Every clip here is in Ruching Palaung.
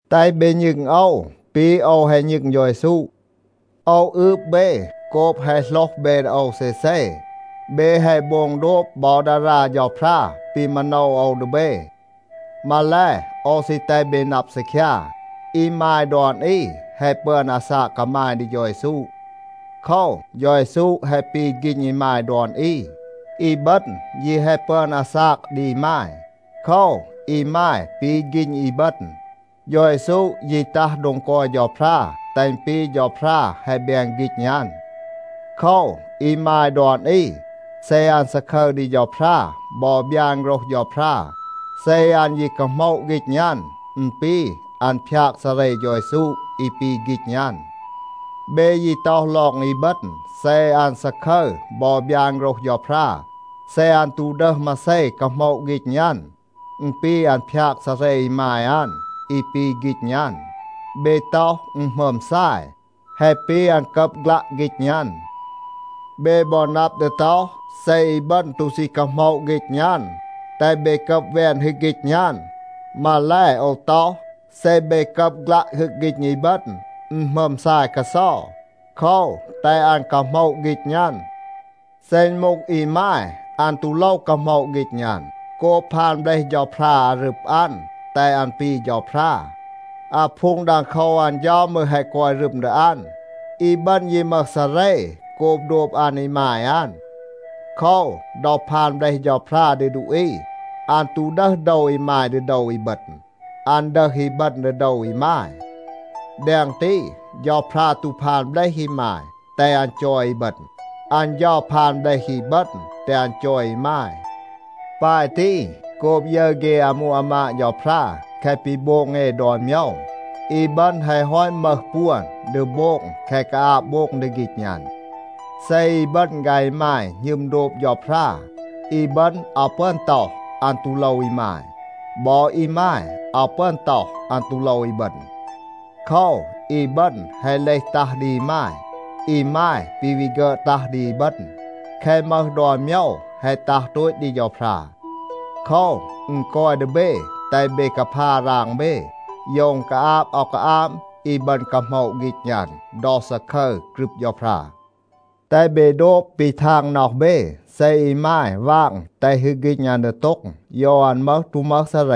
แตห เบ ณึง โอว ปี โอว แฮะ ณึง เฌา เยซู. โอว อืบ เบ โกบ แฮะ โหลห เบ ดี โอว เซเซ. เบ แฮะ โบง โดบ บอ ดารา เฌาพรา ปี มาโนว โอว ดี เบ. มาแล, โอว ซี แตห เบ นับ ซีคยา, อีมาย ดอน อี แฮะ ปึอน อาซาก กามาย ดี เฌา เยซู. โคว, เฌา เยซู แฮะ ปี ฆีณ อีมาย ดอน อี. อีบึณ ยี แฮะ ปึอน อาซาก ดี อีมาย. โคว, อีมาย ปี ฆีณ อีบึณ. เฌา เยซู ยี ตัห โดง กอย เฌาพรา, แตห อึณ ปี เฌาพรา แฮะ แบน ฆีณ อัน. โคว, อีมาย ดอน อี, เซ อัน ซาคึร ดี เฌาพรา บอ บยาน โฆรห เฌาพรา, เซ อัน ยี กาโหมะ ฆีณ อัน, อึณ ปี อัน พยาก ซาเร เฌา เยซู อี ปี ฆีณ อัน. เบ ยี ต็อห ลอง อีบึณ, เซ อัน ซาคึร บอ บยาน โฆรห เฌาพรา, เซ อัน ตู ดึห มาเซ กาโหมะ ฆีณ อัน, อึณ ปี อัน พยาก ซาเร อีมาย อัน อี ปี ฆีณ อัน. เบ ต็อห, อึณ หมึอม ซาย, แฮะ ปี อัน กับ ฆลัะ ฆีณ อัน. เบ บอ นับ ดี ต็อห, เซ อีบึณ ตู ซี กาโหมะ ฆีณ อัน, แตห เบ กับ แวน ฮึก ฆีณ อัน. มาแล, โอว ต็อห, เซ เบ กับ ฆลัะ ฮึก ฆีณ อีบึณ, อึณ หมึอม ซาย กาเซา. โคว, แตห อัน กาโหมะ ฆีณ อัน. เซ อึณ มูห อีมาย, อัน ตู โลว กาโหมะ ฆีณ อัน โกบ พาน เบลห เฌาพรา อารึบ อัน, แตห อัน ปี เฌาพรา. อาพูง ดังโคว อัน เฌา มืร แฮะ กอย รึม ดี อัน. อีบึณ ยี มึห ซาเร โกบ โดบ อัน อีมาย อัน. โคว, ดอ พาน เบลห เฌาพรา ดี ดูอี, อัน ตู ดึห โดว อีมาย ดี โดว อีบึณ. อัน ดึห อีบึณ ดี โดว อีมาย. แดง ตี, เฌาพรา ตู พาน เบลห อีมาย, แตห อัน จอย อีบึณ. อัน เฌา พาน เบลห อีบึณ, แตห อัน จอย อีมาย. ปาย ตี, โกบ ยึร เฆ อามู อามาด เฌาพรา แคะ ปี โบง เอ ดอน โมยว, อีบึณ แฮะ ฮอต มึห ปวน ดี โบง แคะ กาอาบ โบง ดี ฆีณ อัน.a เซ อีบึณ ฆาย อีมาย หณึม โดบ เฌาพรา, อีบึณ อาว ปึอน ต็อห, อัน ตู โลว อีมาย. บอ อีมาย อาว ปึอน ต็อห, อัน ตู โลว อีบึณ. โคว, อีบึณ แฮะ เลห ตัห ดี อีมาย. อีมาย ปี วี ฆึอด ตัห ดี อีบึณ. แคะ มึห ดอน โมยว แฮะ ตัห โตต ดี เฌาพรา. โคว, อึณ กอย ดี เบ, แตห เบ กาพา ราง เบ, โยว อึณ กาอาบ อาว กาอาบ อีบึณ กาโหมะ ฆีณ อัน ดอ ซาคึร กรึบ เฌาพรา. แตห เบ โดบ ปี ทาง น็อห เบ. เซ อีมาย วาง แตห ฮึก ฆีณ อัน ดีโต็ง, โยว อัน มึห ตู มึห ซาเร.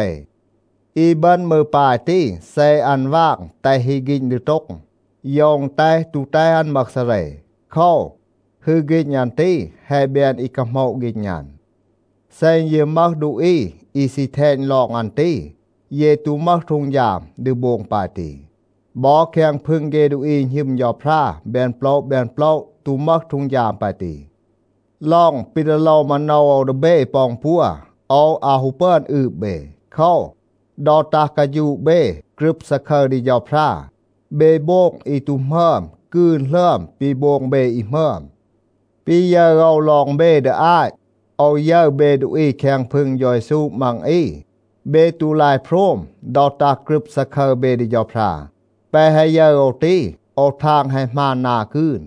อีบึณ มืร ปาย ตี. เซ อัน วาง แตห ฮึก ฆีณ ดีโต็ง, โยว อึณ แตห ตู แตห อัน มึห ซาเร. โคว, ฮึก ฆีณ อัน ตี แฮะ แบน อี กาโหมะ ฆีณ อัน. เซ อึณ ยี มึห ดูอี อี ซี แทณ ลอง อัน ตี, เย ตู มึห ฮีด ดี โบง ปาย ตี. บอ แคง พึง เฆ ดูอี อี หณึม เฌาพรา แบน โปละ แบน โปละ ตู มึห ฮีด ปาย ตี. ลอง ปี ดี โลว โอว มาโนว ดี เบ ปอ อึณปัว, โอว อาว ฮู ปึอน อืบ เบ. โคว, ดอ ตัห กาฌูะ เบ, กรึบ ซาคึร ดี เฌาพรา, เบ โบง อี ตู หมึอม กืน หลึอม ปี โบง เบ อี หมึอม. ปี ยึร โอว ลอง เบ ดี อาต, โอว ยึร เบ ดูอี แคง พึง เฌา เยซู มัง อี, เบ ตู ลาย โพรม ดอ ตัห กรึบ ซาคึร เบ ดี เฌาพรา. แปะ แฮะ ยึร โอว ตี, โอว ทาง แฮะ หมาน นา กืน.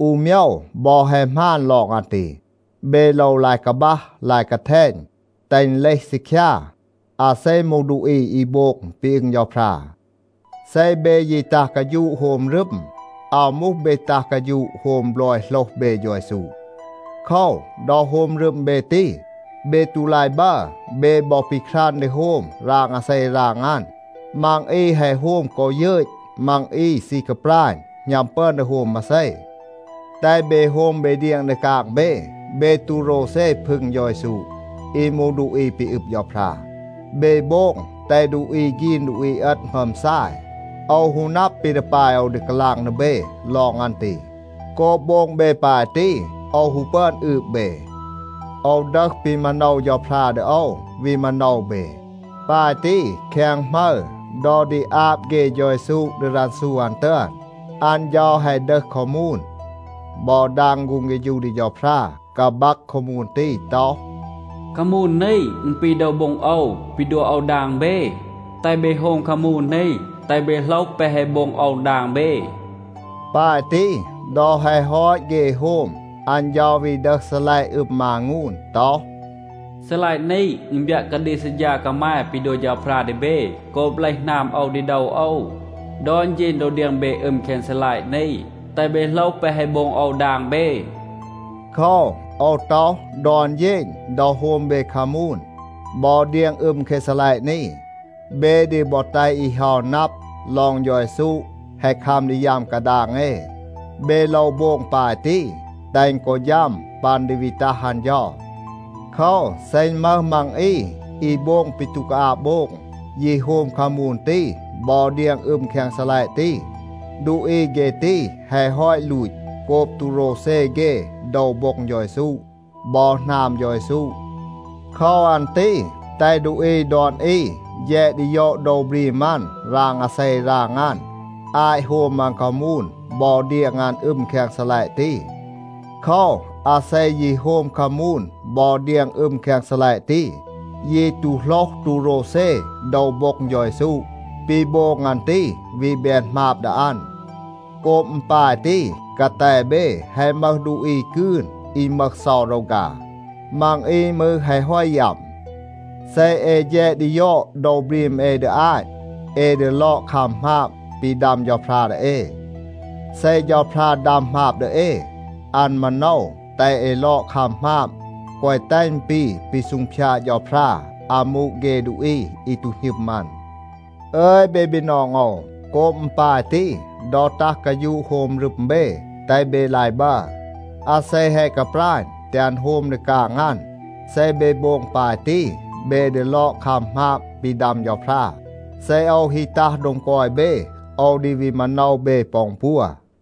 อู โมยว บอ แฮะ หมาน ลอง อัน ตี. เบ โลว ลาย กาบัห, ลาย กาแทณ, แตห อึณ เลห ซีคยา, อาเซ มูห ดูอี อี โบง ปี อึง เฌาพรา. เซ เบ ยี ตัห กาฌูะ โฮม รึม, อาว มูห เบ ตัห กาฌูะ โฮม บลอย โหลห เบ เฌา เยซู. โคว, ดอ โฮม รึม เบ ตี, เบ ตู ลาย บัร. เบ บอ ปีครัน ดี โฮม ราง อาเซ ราง อัน. มัง อี แฮะ โฮม กอ ยึต. มัง อี ซี กาปราณ, หณัม ปึอน ดี โฮม มาเซ. แตห เบ โฮม เบ เดียง ดี กาง เบ. เบ ตู โรวเซ พึง เฌา เยซู อี มูห ดูอี ปี อึบ เฌาพรา. เบ โบง แตห ดูอี ฆีน ดูอี เอต หมึอม ซาย. โอว ฮู นับ ปี ดี ปาย โอว ดี กาลาง ดี เบ ลอง อัน ตี. โกบ โบง เบ ปาย ตี, โอว ฮู ปึอน อืบ เบ. โอว ดึห ปี มาโนว เฌาพรา ดี โอว, วี มาโนว เบ. ปาย ตี, แคง หมึร ดอ ดี อาบ เฆ เฌา เยซู ดี รันซู อัน ตึอน, อัน เฌา แฮะ ดึห คามูน บอ ดาง ฆูง เฆฌู ดี เฌาพรา, กาบัก คามูน ตี ต็อห, “คามูน นี, อึณ ปี โดว โบ็ง โอว ปี ดัว โอว ดาง เบ. แตห เบ โฮม คามูน นี, แตห เบ โหลห แปะ แฮะ โบง โอว ดาง เบ.” ปาย ตี, ดอ แฮะ ฮอต เฆ โฮม, อัน เฌา วี ดึห ซีลัยะ อึม มางูน ต็อห, “ซีลัยะ นี, อึณ บยัะ กาดีก ซัดฌา กามาย ปี ดัว เฌาพรา ดี เบ โกบ เลห หนาม โอว ดี โดว โอว. ดอน เฌณ ดอ เดียง เบ อึม แคง ซีลัยะ นี, แตห เบ โหลห แปะ แฮะ โบง โอว ดาง เบ.” โคว, โอว ต็อห, ดอน เฌณ ดอ โฮม เบ คามูน บอ เดียง อึม แคง ซีลัยะ นี, เบ ดี บอ แตห อี เฮา นับ ลอง เฌา เยซู แฮะ คัม ดี ยัม กาดาง เอ. เบ โลว โบง ปาย ตี, แตห อึณ กอ ฌัม ปัน ดี วี ตัห อัน เฌา. โคว, เซ อึณ มึห มัง อี อี โบง ปี ตู กาอาบ โบง, ยี โฮม คามูน ตี บอ เดียง อึม แคง ซีลัยะ ตี, ดูอี เฆ ตี แฮะ ฮอต ลูต โกบ ตู โรวเซ เฆ โดว โบ็ง เฌา เยซู บอ หนาม เฌา เยซู. โคว อัน ตี แตห ดูอี ดอน อี แฌด ดี ยอด โดว บรีม อัน ราง อาเซ ราง อัน อาต โฮม อัน คามูน บอ เดียง อัน อึม แคง ซีลัยะ ตี. โคว, อาเซ ยี โฮม คามูน บอ เดียง อึม แคง ซีลัยะ ตี, ยี ตู โหลห ตู โรวเซ โดว โบ็ง เฌา เยซู, ปี โบง อัน ตี วี แบน หมาบ ดี อัน. โกบ อึณ ปาย ตี, กาแต เบ แฮะ มึห ดูอี กืน อี มึห เซา รอฆา. มัง อี มืร แฮะ ฮอต ยัม. เซ เอ แฌด ดี ยอด โดว บรีม เอ ดี อาต, เอ ดี ลอด คัม หมาบ ปี ดัม เฌาพรา ดี เอ. เซ เฌาพรา ดัม หมาบ ดี เอ, อัน มาโนว แตห เอ ลอด คัม หมาบ, แกวะ แตห อึณ ปี ปี ซูงพยาด เฌาพรา อามู เฆ ดูอี อี ตู หณึม อัน. อึย เบ บีนอง โอว, โกบ อึณ ปาย ตี, ดอ ตัห กาฌูะ โฮม รึม เบ, แตห เบ ลาย บัร. อาเซ แฮะ กาปราณ, แตห อัน โฮม ดี กาง อัน. เซ เบ โบง ปาย ตี, เบ ดี ลอด คัม หมาบ ปี ดัม เฌาพรา. เซ โอว ฮี ตัห โดง กอย เบ, โอว ดี วี มาโนว เบ ปอ อึณ ปัว.